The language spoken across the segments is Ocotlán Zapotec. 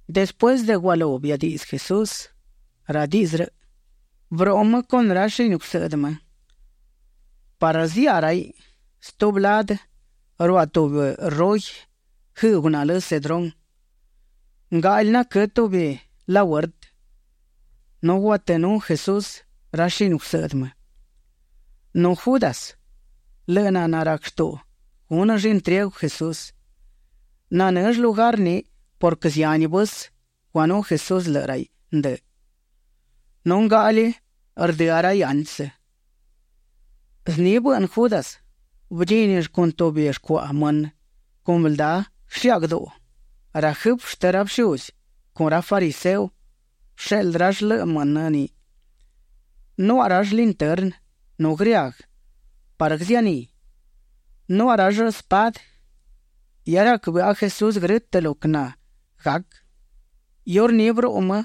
Despuësë de gualú biadiꞌdzë Jesús ra diꞌdzë rëꞌ, bëruꞌu më con ra shini gusëꞌdë më parë ziaꞌa raiꞌ stubi ladë ruaꞌ tubi rugi guëëꞌgu nalë Cedrón. Ngaꞌli naquë́ tubi lahuertë, nu guatënú Jesús ra shini gusëꞌdë më. Nu Judas, lëꞌë naná rac shtuꞌu gúnëll intriegu Jesús, nanëll lugar ni purquë zihani vësë guanú Jesús lëꞌë raiꞌ ndë. Nu ngaꞌli rdëá raiꞌ antsë. Zni bëꞌnë Judas; bëdchínill con tubi shcuaꞌa mënë con bëldá guëshiágduꞌu. Ra jëfë shtë ra bëshuzi con ra fariseo bësheꞌldë rall lëꞌë mënë ni. Nuaꞌa rall lintërnë nu grëaguë parë guëzianí. Nuaꞌa rall spadë. Hia rac bëꞌa Jesús grë́tëꞌ lo quë nanagac; iurní bëruꞌu më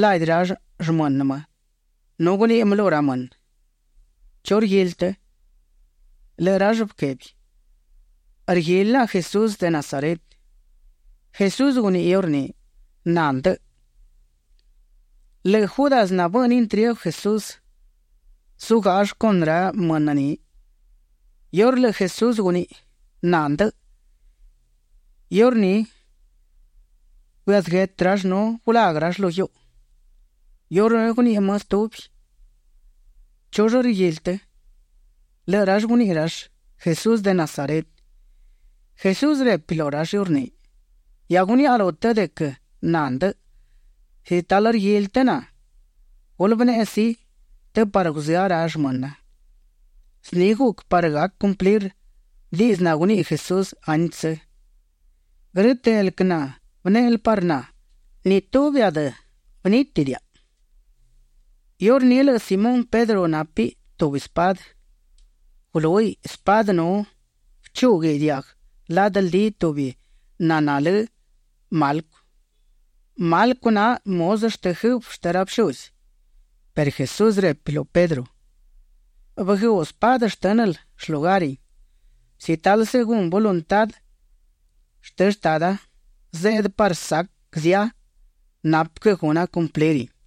ladi ra shmënë më nu guniꞌi më lu ra mënë: ―¿Chu rguili të? Lëꞌë rall bëquebi: ―Rguili naꞌa Jesús de Nazaret. Jesús guniꞌi iurní: ―Na ndëꞌë. Lëꞌë Judas nabëꞌnë intriegu Jesús, zugáꞌall con ra mënë ni. Iurë lëꞌë Jesús guniꞌi: “Na ndëꞌë”, iurní bëazë guetë rall nu gulaguë rall lu guiuꞌu. Iurní guniꞌi më stubi: ―¿Chull rguili të? Lëꞌë rall guniꞌi rall: ―Jesús de Nazaret. Jesús repi lu rall iurní: ―Hia guniaꞌa lu të de quë na ndëꞌë. Si talë rguili të na, gulë bëneꞌe sí, të parë guzëá ra shmëna. Zni guc parë gac cumplir diꞌdzë naguniꞌi Jesús antsë: “Grë́tëꞌ el quë nabënéꞌel parë na, ni tubi adë gunítidiaꞌa”. Iurní lëꞌë Simón Pedro nápiꞌ tubi spadë; gulúhiꞌ spadë nu bëchúguiꞌ diaguë ladë ldi tubi naná lë Malco. Malco na muzë shtë jëfë shtë ra bëshuzi. Perë Jesús repi lu Pedro: ―Bëguëuꞌ spadë shtë́nël shlugarin. Si talë según voluntá shtë Shtada zeꞌdë parë sac zia, napë quë guna cumplirin.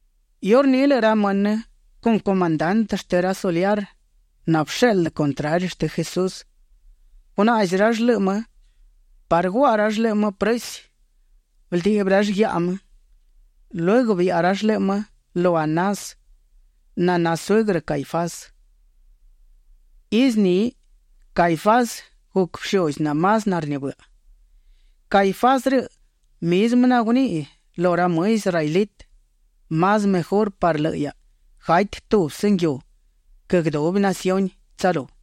Iurní lëꞌë ra mënë con comandante shtë ra soliar nabësheꞌldë contrari shtë Jesús, gunaꞌzi rall lëꞌë më parë guaꞌa rall lëꞌë më prësi. Bëldiꞌbi rall guiaꞌa më. Lueguë biaꞌa rall lëꞌë më lu Anás naná suëgrë Caifás. Izë ni Caifás guc bëshuzi namás narnibëꞌa. Caifás rëꞌ mizmë naguniꞌi lu ra më israelitë: “Más mejurë parë lëꞌë hiaꞌa gati tubsë nguiu quë guëdubi naciuni tsalú”.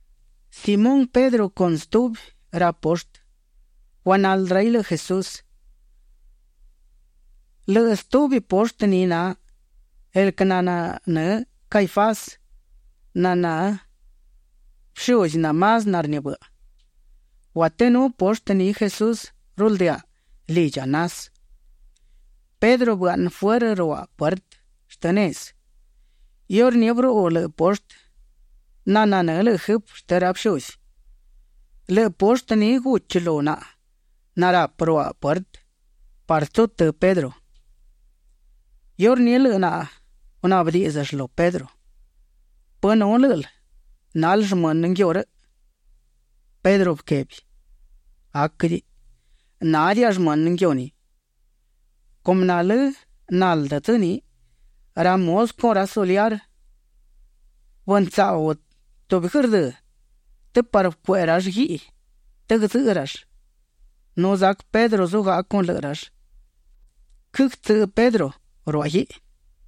Simón Pedro con stubi ra poshtë, guanaldë raiꞌ lëꞌë Jesús. Lëꞌë stubi poshtë ni na el quë nanë́ Caifás naná bëshuzi namás narnibëꞌa. Guatënú poshtë ni Jesús rualdëaꞌ lidchi Anás. Pedro bëaꞌnë fuërë ruaꞌ puertë shtë nezë. Iurní bëruꞌu lëꞌë poshtë nananë́ lëꞌë jëfë shtë ra bëshuzi. Lëꞌë poshtë ni guchi lu naꞌa narapë ruaꞌ puertë parë tsutë́ Pedro. Iurní lëꞌë naꞌa gunaꞌbë díꞌdzëll lu Pedro: ―¿Pë nu lë́ꞌël nal shmënë nguiu rëꞌ? Pedro bëquebi: ―Aquëdiꞌi, nádiaꞌa shmënë nguiu ni. Cumë nalë́ naldë dzë ni, ra muzë con ra soliar bëntsaꞌu tubi guërdë́ të parë bëcueꞌe rall guiꞌi të guëdzëꞌë rall. Nu zac Pedro zugaꞌa con lëꞌë rall. Quëtsëꞌë Pedro ruaꞌ guiꞌi.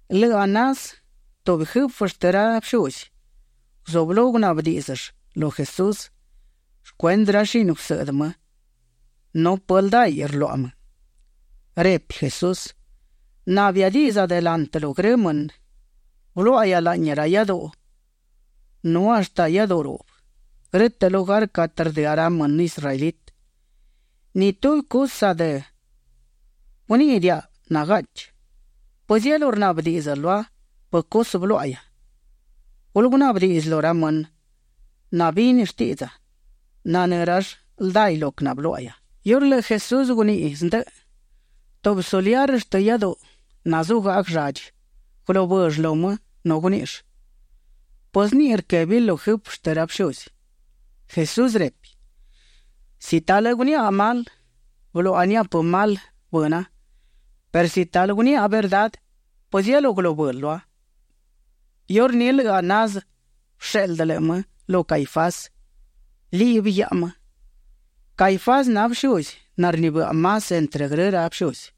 Lëꞌë Anás, tubi jëfë shtë ra bëshuzi, guzublú gunaꞌbë díꞌdzëll lu Jesús shcuendë ra shini gusëꞌdë më nu pë ldaiꞌ rluaꞌa më. Repi Jesús: ―Na biadiꞌdza delantë lu grë mënë. Bëluáꞌahia laꞌni ra iáduꞌu nu hashtë iáduꞌu ruꞌbë, grë́tëꞌ lugar catë rdëá ra mënë israelitë. Ni tubi cusë adë guníꞌidiaꞌa nagaꞌchi. ¿Pëzielú rnaꞌbë díꞌdzël lua pë cusë bëluáꞌahia? Gulë gunaꞌbë diꞌdzë lu ra mënë nabini shtiꞌdza. Nanë́ rall ldaiꞌ lo quë bëluáꞌahia. Iurë lëꞌë Jesús guniꞌi zndëꞌë, tubi soliar shtë iáduꞌu nazugaꞌa guëlladchi, gulubëll lu më nu guníꞌill: ―¿Pë zniꞌi rquébil lu jëfë shtë ra bëshuzi? Jesús repi: ―Si talë guniaꞌa mal, bëluaꞌa nia pë mal bëna perë si talë guniaꞌa verdá ¿pëzielú gulubël lua? Iurní lëꞌë Anás bësheꞌldë lëꞌë më lu Caifás. Liꞌbi guiaꞌa më. Caifás na bëshuzi narnibëꞌa más entrë grë ra bëshuzi.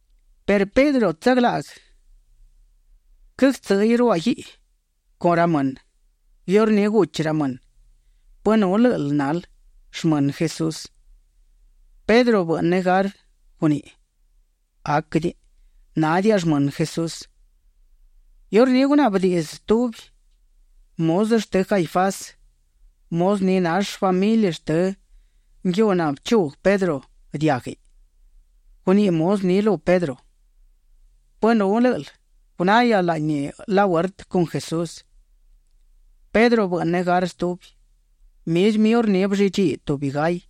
Perë Pedro tsaglaꞌguë quëgtsë́ꞌëiꞌ ruaꞌ guiꞌi con ra mënë. Iurní guchi ra mënë: ―¿Pë nul lë́ꞌël nal shmënë Jesús? Pedro bëꞌnë negar; guníꞌiꞌ: ―Aquëdiꞌi, nádiaꞌa shmënë Jesús. Iurní gunaꞌbë diꞌdzë tubi muzë shtë Caifás, muzë ni nall shfamili shtë nguiu nabëchuguë Pedro diáguiꞌ. Guniꞌi muzë ni lu Pedro: ―¿Pë nul lë́ꞌël gunahia laꞌni lahuertë con Jesús? Pedro bëꞌnë negar stubi. Mizmë iurní bëllidchí tubi gay.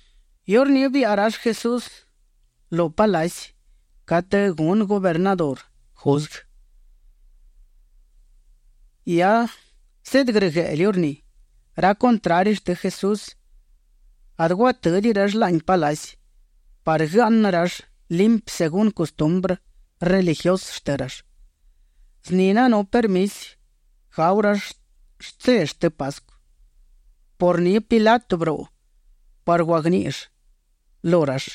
Iurní biaꞌa rall Jesús lu palaci catë gunë gubernadurë juzguë. Hia zeꞌdë grëgueꞌlë iurní. Ra contrari shtë Jesús adë guatë́diꞌi rall laꞌni palaci parë guëaꞌnë rall limpi según custumbrë religiusë shtë rall. Zni nanú permisi gau rall shtse shtë Pascu. Por ni Pilato bëruꞌu parë guagníꞌill lu rall: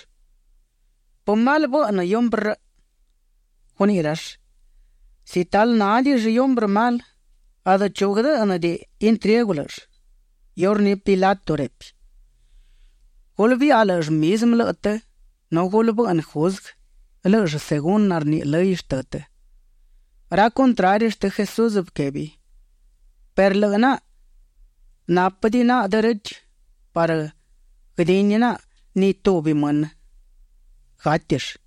―¿Pë mal bëꞌnë hiumbrë rëꞌ? Guniꞌi rall: ―Si talë nádiꞌill hiumbrë mal, adë chu guëdë́ꞌnëdiꞌi intriegu lë́ꞌëll. Iurní Pilato repi: ―Gulë biaꞌa lë́ꞌëll mizmë lëꞌë të nu gulë bëꞌnë juzguë lë́ꞌëll según narniꞌi lëy shtë të. Ra contrari shtë Jesús bëquebi: ―Perë lëꞌë naꞌa nápëdiꞌi naꞌa derechë parë guëdini naꞌa ni tubi mënë gátill.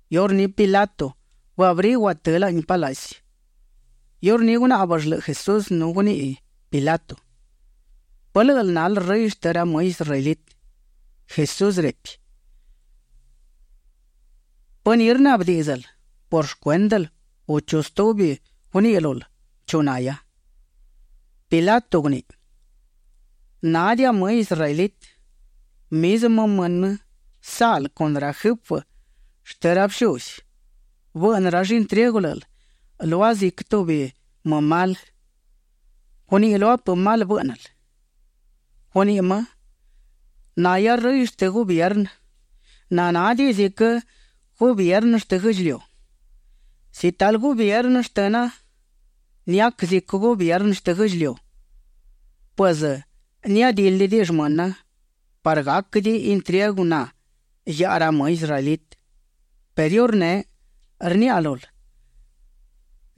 Iurní Pilato bëabrí guatë́ laꞌni palaci; iurní gunáꞌbëll lëꞌë Jesús nu guniꞌi Pilato: ―¿Pë lë́ꞌël nal Rëy shtë ra më israelitë? Jesús repi: ―¿Pë ni rnaꞌbë díꞌdzël por shcuéndël u nu chu stubi guniꞌi lul chu nahia? Pilato guniꞌi: ―Nádiaꞌa më israelitë. Mizmë mënë saꞌl con ra jëfë shtë ra bëshuzi, bëꞌnë rall intriegu lë́ꞌël lua ziquë tubi më mal. Guniꞌi lua pë mal bë́ꞌnël. Guniꞌi më: ―Nahia Rëy shtë gubiernë nanádiꞌi ziquë gubiernë shtë guë́ꞌdchiliu. Si talë gubiernë shtëna niac ziquë gubiernë shtë guë́ꞌdchiliu, pues niadildi shmëna parë gáquëdiꞌi intriegu na guiaꞌa ra më israelitë. Perë iurneꞌ rniaꞌa lul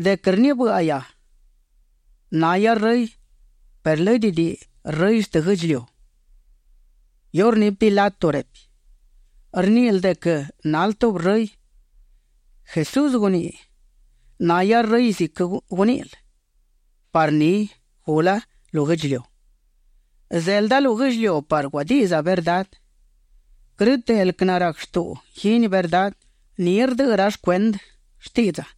de quë rnibë́ꞌahia; nahia Rëy perë lë́dëdiꞌi rëy shtë guë́ꞌdchiliu. Iurní Pilato repi: ―Rníꞌil de quë nal tubi Rëy. Jesús guniꞌi: ―Nahia Rëy ziquë quëgníꞌil, parë ni gula lu guë́ꞌdchiliu. Zelda lu guë́ꞌdchiliu parë guadiꞌdza verdá. Grë́tëꞌ el quë narac shtuꞌu guini verdá, ni rdëꞌë rall cuendë shtiꞌdza.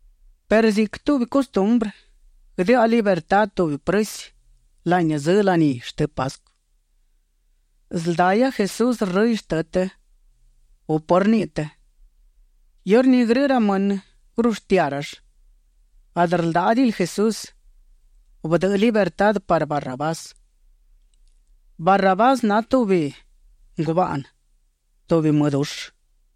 perë ziquë tubi custumbrë, guëdëꞌa libertá tubi prësi laꞌni dzë laní shtë Pascu. ¿Sëldahia Jesús rëy shtë të, u pë rniꞌi të? Iurní grë ra mënë gurushtiá rall: ―Adë rldáꞌadiꞌil Jesús; bëdëꞌë libertá parë Barrabás. Barrabás na tubi ngubaꞌnë, tubi më dushë.